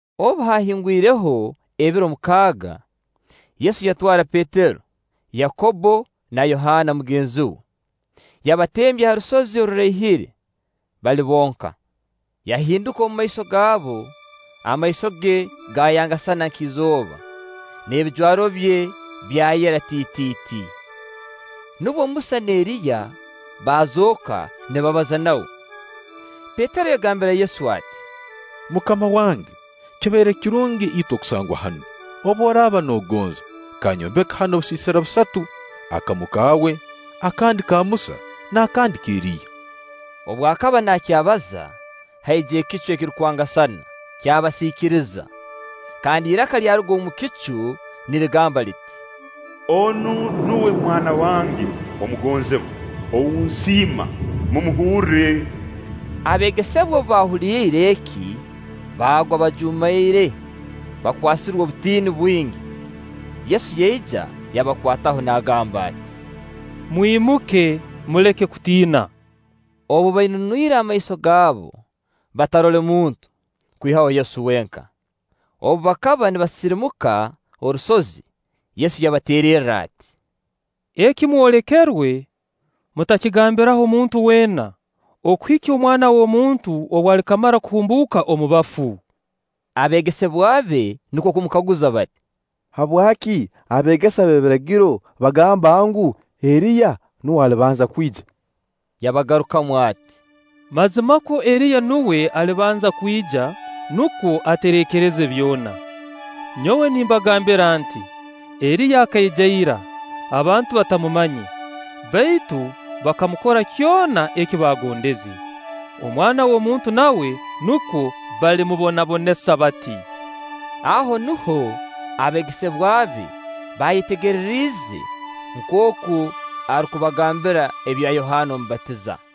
Obu haahingwireho ebiro mukaaga, Yesu yatwara Petero, Yakobbo na Yohaana mugenzi we, yabatembya ha rusozi oruraihire bali bonka. Yahinduka omumaiso gaabo, amaiso ge gaayangasana nk'izooba, n'ebijwaro bye byayera tiitiiti. Nubwo Musa na Eriya baazooka nibabaza nawe. Petero yagambire Yesu ati; “MUKAMA wange, kibaire kirungi itwe kusangwa hanu; obu oraaba nogonza, kanyombeke hanu obusiisira busatu: akamu kaawe, akandi ka Musa, n'akandi ka Eriya.” Obu akaba naakyabaza, haija ekicu ekirukwangasana, kyabasiikiriza; kandi iraka lyaruga omu kicu, nirigamba liti: “Onu nuwe Mwana wange omugonzibwa ou nsiima; mumuhurre.” Abeegesebwa obu baahuliire eki, baagwa bajuumaire, bakwasirwe obutiini bwingi. Yesu yaija yabakwataho naagamba ati: “Mwimuke, muleke kutiina,” Obu bainunwire amaiso gaabo, batarole muntu, kwihaho Yesu wenka. Obu bakaba nibasirimuka orusozi, Yesu yabateererra ati: “Eki mwolekerwe, mutakigambiraho muntu weena, okuhikya Omwana w'omuntu obu alikamara kuhumbuuka omu bafu.” Abeegesebwa be nukwo kumukaguza bati: “Habwaki abeegesa b'ebiragiro bagamba ngu: Eriya nuwe alibanza kwija?” Yabagarukamu ati: “Mazimakwo Eriya nuwe alibanza kwija, nukwo atereekereze byona. Nyowe nimbagambira nti: Eriya akaija ira, abantu batamumanye, baitu bakamukora kyona eki baagondeze. Omwana w'omuntu nawe nukwo balimubonabonesa bati.” Aho nuho abeegesebwa be baayetegereriize nkooku arukubagambira ebyo Yohaana Omubatiza.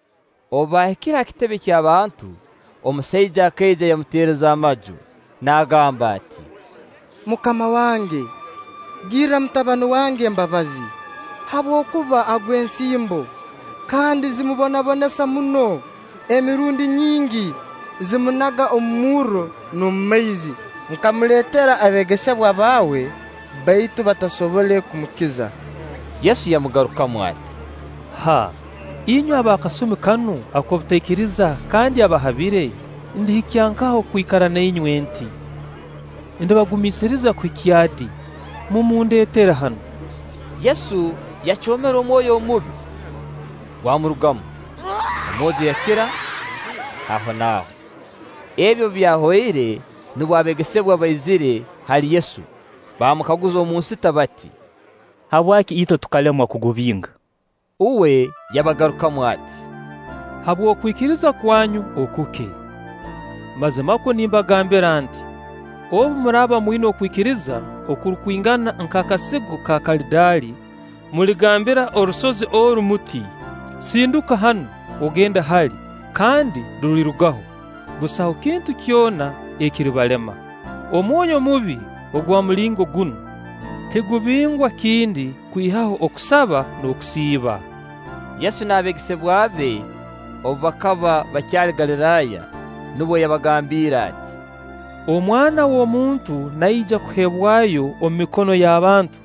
Obu baahikire ha kitebe ky'abantu, omusaija akaija yamutereza amaju, naagamba ati: “MUKAMA wange, girra mutabani wange embabazi, habwokuba agwa ensimbo kandi zimubonabonesa muno; emirundi nyingi zimunaga omu murro n'omu maizi. Nkamuleetera abeegesebwa baawe, baitu batasobole kumukiza.” Yesu yamugarukamu ati: “Haa! Inywe ab'akasumi kanu ak'obutaikiriza kandi abahabire, ndihikya nkaha okwikara na inywe nti? Ndibagumiisiriza kuhikya di? Mumundeetere hanu.” Yesu yacoomera omwoyo omubi, gwamurugamu, omwojo yakira ahonaaho. Ebi obu byahoire nubwo abeegesebwa baizire hali Yesu baamukaguza omu nsita bati: “Habwaki itwe tukalemwa kugubinga?” Uwe yabagarukamu ati: Habw'okwikiriza kwanyu okuke. Mazimakwo nimbagambira nti: Obu muraaba mwina okwikiriza okurukwingana nk'akasigo ka karadaali, muligambira orusozi oru muti: “Sinduka hanu, ogende hali' kandi rulirugaho; busaho kintu kyona ekiribalema.” ( Omwoyo omubi ogwa mulingo gunu tigubingwa kindi, kwihaho okusaba n'okusiiba.) Yesu n'abeegesebwa be obu bakaba bakyali Galiraaya, nubwo yabagambiire ati: “Omwana w'omuntu naija kuheebwayo omu mikono y'abantu,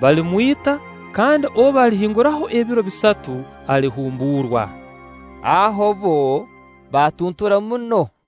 balimwita, kandi obu halihinguraho ebiro bisatu alihumbuurwa.” Aho bbo baatuntura muno.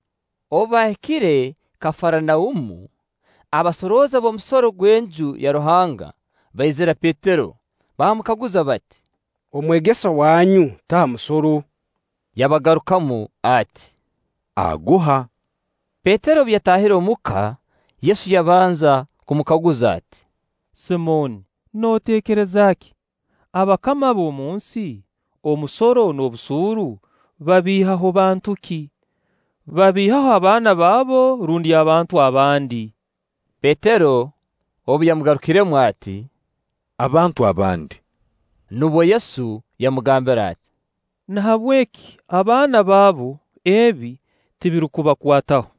Obu baahikire Kafaranaumu, abasorooza b'omusoro gw'Enju ya Ruhanga baizira Petero baamukaguza bati: “Omwegesa wanyu taha musoro?” Yabagarukamu ati: “Aguha.” Petero obu yataahire omu ka, Yesu yabanza kumukaguza ati: “Simooni nooteekereza ki? Abakama ab'omunsi, omusoro n'obusuuru babiihaho bantu ki? Babiihaho abaana baabo rundi abantu abandi?” Petero obu yamugarukiremu ati: “Abantu abandi”, nubwo Yesu yamugambira ati: “Nahabweki abaana baabu, ebi tibirukubakwataho.